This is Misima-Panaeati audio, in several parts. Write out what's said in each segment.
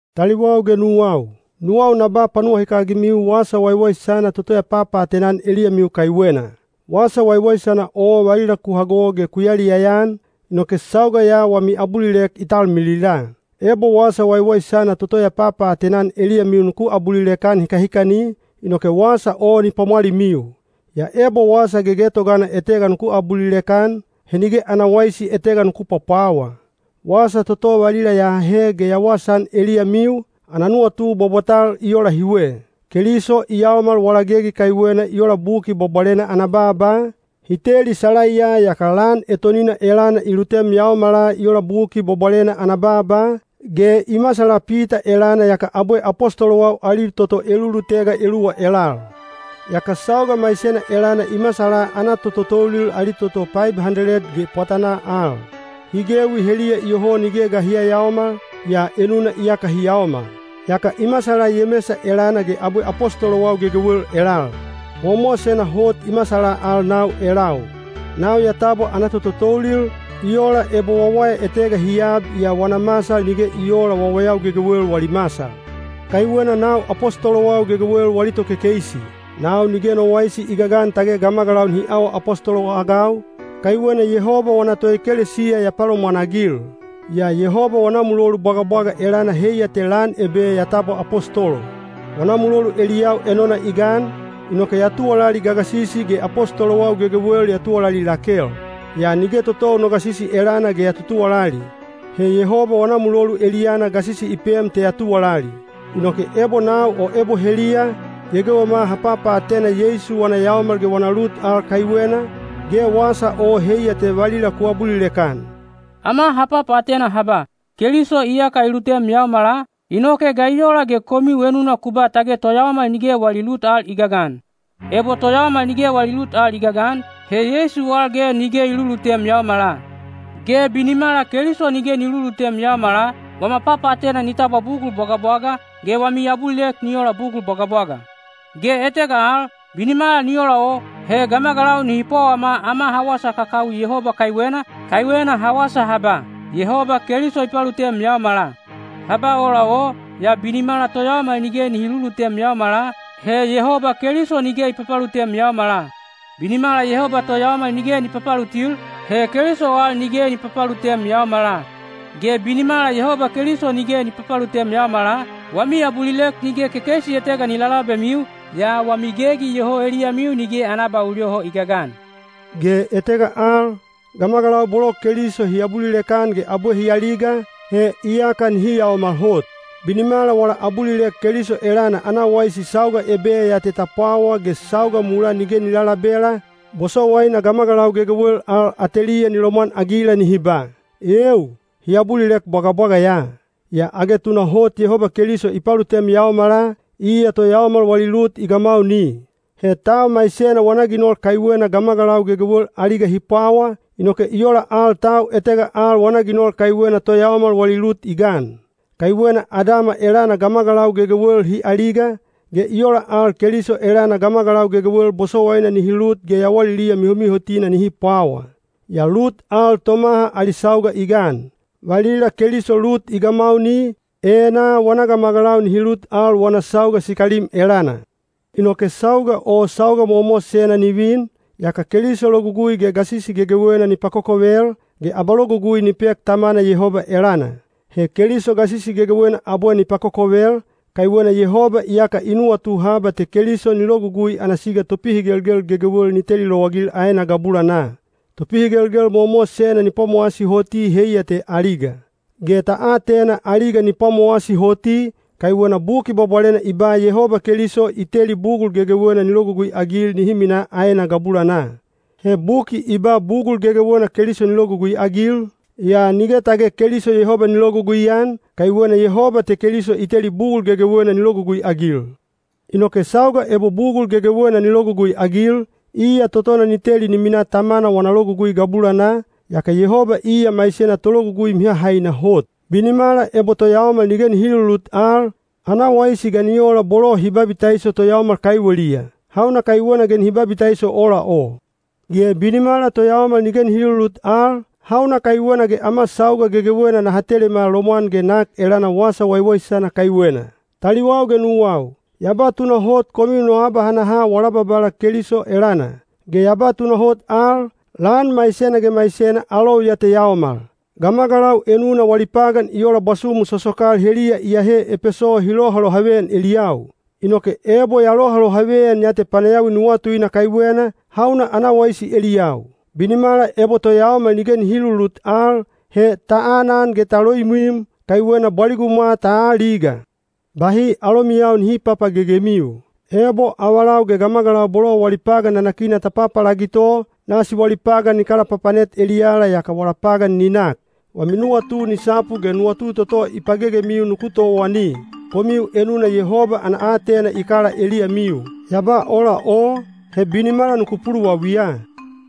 Taliwau ge nuwau, nuwau na ba panuwahikagimiu wasa waiwaisana toto ya papaatena-an eliyamiu kaiwena. Wasa waiwaisana o valila ku hago ge ku yaliyaya-an, inoke sauga ya wami abulilek i talmilila. Ebo wasa waiwaisana toto ya papaatena-an eliyamiu nuku abulilek-an hikahikani, inoke wasa o ni pwamwalimiu. Yaa ebo wasa gegetogana etega nuku abulilek-an, he nige ana waisi etega nuku pwapwawa. Wasa toto valila ya ahe ge ya wasaan eliyamiu, ana nuwatu bwabwatal i ola hiwe: Keliso i yaomal wala gegi kaiwena i ola Buki Bwabwalena ana baaba, hi teli salaiya yaka lan etonina elana i lutem yaomala i ola Buki Bwabwalena ana baaba, ge i masala Pita elana yaka abwe apostolowau ali toto elulutega eluwa elal. Yaka sauga maisena elana i masala ana tototoulil ali toto paib handeled ge pwatanaa al. Hi gewi heliya iyoho nige ga hi yayaomal, yaa enuna iyaka hi yaomal. Yaka i masala Yemesa elana ge abwe apostolowau gegewel elal. Mowamowasena hot i masala al nau elau. Nau ya tabwa ana tototoulil, i ola ebo wawaya etega hi ab yaa wana masal nige i oola wawayau gegewel wali masal. Kaiwena nau apostolowau gegewel wali tokekeisi. Nau nige no waisi i gagan tage gamagalau nihi awa apostolo-agau, kaiwena Yehoba wana toekelesiya ya palomwanagil. Yaa Yehoba wana mulolu bwagabwaga elana heiya te lan ebe ya tabwa apostolo. Wana mulolu eliyau enona i gan, inoke ya tuwalali gagasisi ge apostolowau gegewel ya tuwalali lakel. Yaa nige totou no gasisi elana ge ya tutuwalali. He Yehoba wana mulolu eliyana gasisi i pem te ya tuwalali. Inoke ebo nau o ebo heliya, gegewema ha papaatena Yeisu wana yaomal ge wana lut al kaiwena, ge wasa o heiya te valila ku abulilek-an. Ama ha papaatena ha ba, “Keliso iyaka i lutem yaomala,” inoke ga i ola ge komiu enuna ku ba tage toyaomal nige wali lut al i gagan? Ebo toyaomal nige wali lut al i gagan, he Yeisu al ge nige i lulutem yaomala. Ge binimala Keliso nige ni lulutem yaomala, wama papaatena ni tabwa bugul bwagabwaga, ge wami abulilek ni ola bugul bwagabwaga. Ge etega al, binimala ni ola o, he gamagalau nihi pwawama ama ha wasa kakawi Yehoba kaiwena, kaiwena ha wasa ha ba, “Yehoba Keliso i palutem yaomala.” Ha ba ola o, yaa binimala toyaomal nige nihi lulutem yaomala, he Yehoba Keliso nige i papalutem yaomala. Binimala Yehoba toyaomal nige ni papalutil, he Keliso al nige ni papalutem yaomala. Ge binimala Yehoba Keliso nige ni papalutem yaomala, wami abulilek nige kekeisi etega ni lalabemiu, yaa wami gegi iyoho eliyamiu nige ana abaul yoho i gagan. Ge etega al, gamagalau bolo Keliso hi abulilek-an ge abwe hi aliga, he iyaka nihi yaomal hot. Binimala wala abulilek Keliso elana ana waisi sauga ebe ya te ta pwawa ge sauga mulaa nige ni lalabela, bosowaina gamagalau gegewel al ateliya ni lomwanagila nihi ba, “Eeu! Hi abulilek bwagabwaga ya.” Yaa age tunahot Yehoba Keliso i palutem yaomala, iya toyaomal wali lut i gamauni. He tau maisena wana ginol kaiwena gamagalau gegewel aliga hi pwawa, inoke i ola al tau etega al wana ginol kaiwena toyaomal wali lut i gan. Kaiwena Adama elana gamagalau gegewel hi aliga, ge i ola al Keliso elana gamagalau gegewel bosowaina nihi lut ge yawaliliya mihomihotina nihi pwawa. Yaa lut al tomaha ali sauga i gan: valila Keliso lut i gamauni, enaa wana gamagalau nihi lut al wana sauga sikalim elana. Inoke sauga o sauga mowamowasena ni vin, yaka Keliso logugui ge gasisi gegewena ni pakokovel, ge abalogugui ni pek Tamana Yehoba elana. He Keliso gasisi gegewena abwe ni pakokovel, kaiwena Yehoba iyaka i nuwatu haba te Keliso ni logugui ana siga topihigelgel gegewel ni teli lowagil aena gabulanaa. Topihigelgel mowamowasena ni pwamowasi hoti heiya te aliga. Ge ta atena aliga ni pwamowasi hoti, kaiwena Buki Bwabwalena i ba Yehoba Keliso “i teli bugul gegewel ni logugui-agil.” (He buki i ba “bugul gegewel” Keliso ni logugui-agil, yaa nige tage Keliso Yehoba ni logugui-an, kaiwena Yehoba te Keliso i teli bugul gegewel ni logugui-agil.) Inoke sauga ebo bugul gegewel ni logugui-agil, iya totona ni teli ni minaa Tamana wana logugui gabulanaa, yaka Yehoba iya maisena tologugui mihahaina hot. Binimala ebo toyaomal nige nihi lulut al, ana waisi ga ni ola bolo hi babitaiso toyaomal kaiweliya? Hauna kaiwena ge nihi babitaiso ola o? Ge binimala toyaomal nige nihi lulut al, hauna kaiwena ge ama sauga gegewena naha telema lomwan ge nak elana wasa waiwaisana kaiwena? Taliwau ge nuwau, ya ba tunahot komiu no abahanaha wala Babala Keliso elana. Ge ya ba tunahot al, lan maisena ge maisena alou ya te yaomal. Gamagalau enuna wali pagan i ola bwasumu sosokal heliya iyahe Epeso hi lohalohaveyan eliyau. Inoke ebo ya lohalohaveyan ya te panayawi nuwatuina kaiwena, hauna ana waisi eliyau? Binimala ebo toyaomal nige nihi lulut al, he “ta anan ge ta loimwim, kaiwena bwaligumwa ta aaliga.” Bahi alomiyau nihi papagegemiu. Ebo avalau ge gamagalau bolo wali pagan nanakina ta papalagito, nasi wali pagan ni kalapapanet eliyala yaka wala pagan ni nak. Wami nuwatu ni sapu ge nuwatu toto i pagegemiu nuku towani. Komiu enuna Yehoba ana aatena i kala eliyamiu. Ya ba ola o, he binimala nuku puluwawiya.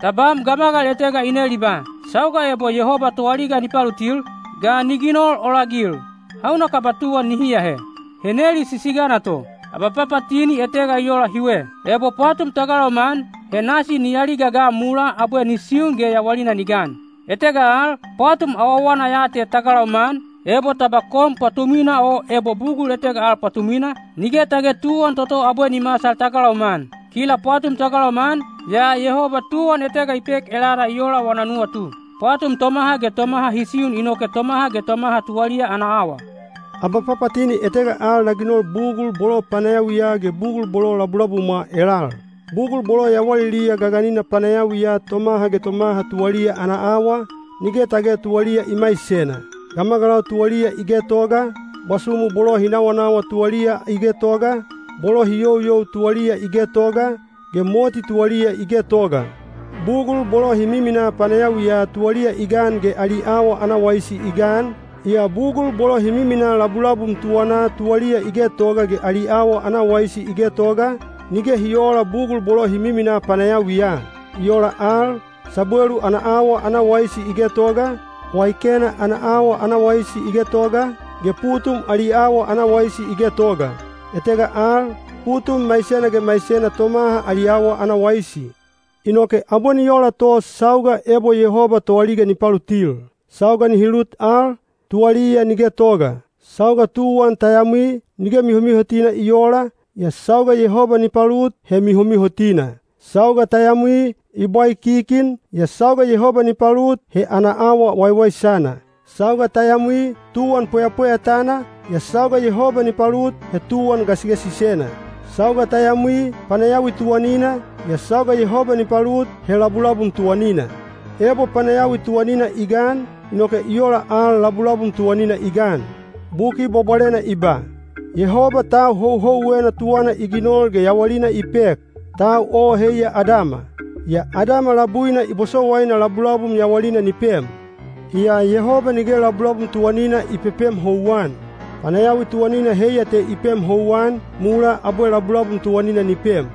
Tabam gamagal etega i nel i ba, “Sauga ebo Yehoba toaliga ni palutil, ga ni ginol ola-agil? Hauna kaba tuwan nihi ahe?” He neli sisigana to. Abapapatini etega i ola hiwe. Ebo pwatum ta galauma-an, he nasi ni aliga ga mulaa abwe ni siun ge yawalina ni gan. Etega al, pwatum awawana ya te ta galauma-an, ebo ta ba kon pwatumwina o ebo bugul etega al pwatumwina, nige tage tuwan toto abwe ni masal ta galauma-an. Kila pwatum ta galauma-an, yaa Yehoba tuwan etega i pek elana i ola wana nuwatu. Pwatum tomaha ge tomaha hi siun inoke tomaha ge tomaha tuwaliya ana awa. Abapapatini etega al na ginol bugul bolo panayawiya ge bugul bolo labulabumwa elal. Bugul bolo yawaliliya gaganina panayawiya tomaha ge tomaha tuwaliya ana awa, nige tage tuwaliya i maisena. Gamagalau tuwaliya i getoga, bwasumu bolo hi nawanawa tuwaliya i getoga, bolo hi youyou tuwaliya i getoga, ge moti tuwaliya i getoga. Bugul bolo hi miminaa panayawiya tuwaliya i gan ge ali awa ana waisi i gan, yaa bugul bolo hi miminaa labulabum tuwanaa tuwaliya i getoga ge ali awa ana waisi i getoga, nige hi oola bugul bolo hi miminaa panayawiya. I ola al, sabwelu ana awa ana waisi i getoga, waikena ana awa ana waisi i getoga, ge putum ali awa ana waisi i getoga. Etega al, putum maisena ge maisena tomaha ali awa ana waisi. Inoke abwe ni ola to sauga ebo Yehoba toaliga ni palutil. Sauga nihi lut al, tuwaliya ni getoga. Sauga tuwan ta yamwi, nige mihomihotina i oola, yaa sauga Yehoba ni palut, he mihomihotina. Sauga ta yamwi, i bwaikikin, yaa sauga Yehoba ni palut, he ana awa waiwaisana. Sauga ta yamwi, tuwan pweyapweyatana, yaa sauga Yehoba ni palut, he tuwan gasigasisena. Sauga ta yamwi, panayawi tuwanina, yaa sauga Yehoba ni palut, he labulabum tuwanina. Ebo panayawi tuwanina i gan, inoke i ola al labulabum tuwanina i gan. Buki Bwabwalena i ba, “Yehoba tau houhouwena tuwana i ginol ge yawalina i pek.” Tau o heiya Adama. Yaa Adama labuina i bosowaina labulabum yawalina ni pem. Yaa Yehoba nige labulabum tuwanina i pepem houwan. Panayawi tuwanina heiya te i pem houwan, mulaa abwe labulabum tuwanina ni pem.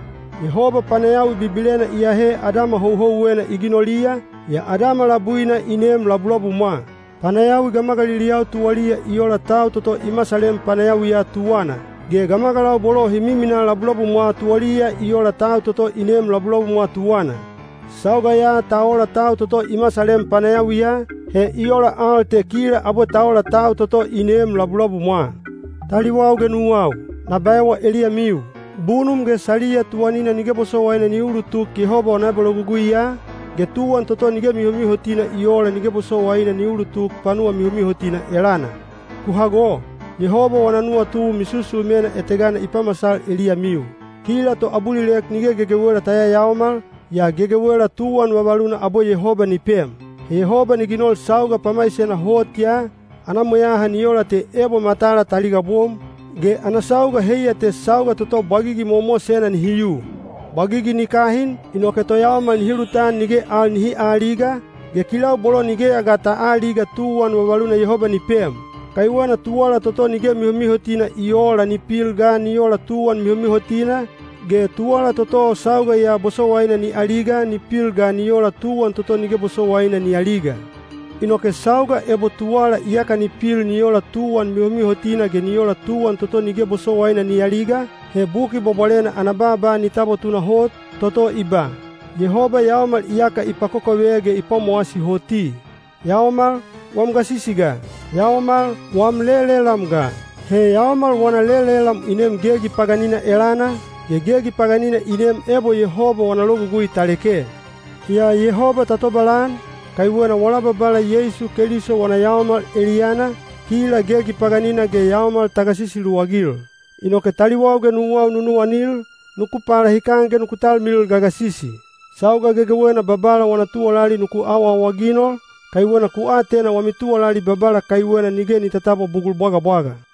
Yehoba panayawi bibilena i ahe Adama houhouwena i ginoliya, yaa Adama labuina i neem labulabumwa. Panayawi gamagaliliyau tuwaliya i ola tau toto i masalem panayawiya tuwana. Ge gamagalau bolo hi miminaa labulabumwa tuwaliya i ola tau toto i neem labulabumwa tuwana. Sauga ya ta ola tau toto i masalem panayawiya, he i ola al te kila abwe ta ola tau toto i neem labulabumwa. Taliwau ge nuwau, na baewa eliyamiu: bunum ge saliya tuwanina nige bosowaina ni ulutuk Yehoba wana abaloguguiya, ge tuwan toto nige mihomihotina i oola nige bosowaina ni ulutuk panuwa mihomihotina elana. Ku hago! Yehoba wana nuwatu misusumena etegana na pamasal eliyamiu. Kila toabulilek nige gegewela ta yayaomal, yaa gegewela tuwan vavaluna abwe Yehoba ni pem. He Yehoba ni ginol sauga pamaisena hot ya, ana mweyaha ni ola te ebo matala ta ligabom, ge ana sauga heiya te sauga toto bwagigi mowamowasena nihi yu. Bwagigi ni kahin, inoke toyaomal nihi lutan nige al nihi aaliga, ge kilau bolo nigeya ga ta aaliga tuwan vavaluna Yehoba ni pem. Kaiwena tuwala toto nige mihomihotina i oola ni pil ga ni ola tuwan mihomihotina, ge tuwala toto sauga ya bosowaina ni aliga ni pil ga ni ola tuwan toto nige bosowaina ni aliga. Inoke sauga ebo tuwala iyaka ni pil ni ola tuwan mihomihotina ge ni ola tuwan toto nige bosowaina ni aliga, he Buki Bwabwalena ana baaba ni tabwa tunahot, toto i ba: “Yehoba yaomal iyaka i pakokove ge i pwamowasi hoti.” “Yaomal, wam gasisi ga? Yaomal, wam lelelam ga?” He yaomal wana lelelam i neem gegi paganina elana, ge gegi paganina i neem ebo Yehoba wana logugui ta leke. Yaa Yehoba ta tobalan, kaiwena wala Babala Yeisu Keliso wana yaomal eliyana, kila gegi paganina ge yaomal ta gasisi luwagil. Inoke taliwau ge nuwau nunuwanil, nuku palahikan ge nuku talmilil gagasisi. Sauga gegewena Babala wana tuwalali nuku awaawaginol, kaiwena ku atena wami tuwalali Babala kaiwena nige ni tatabwa bugul bwagabwaga.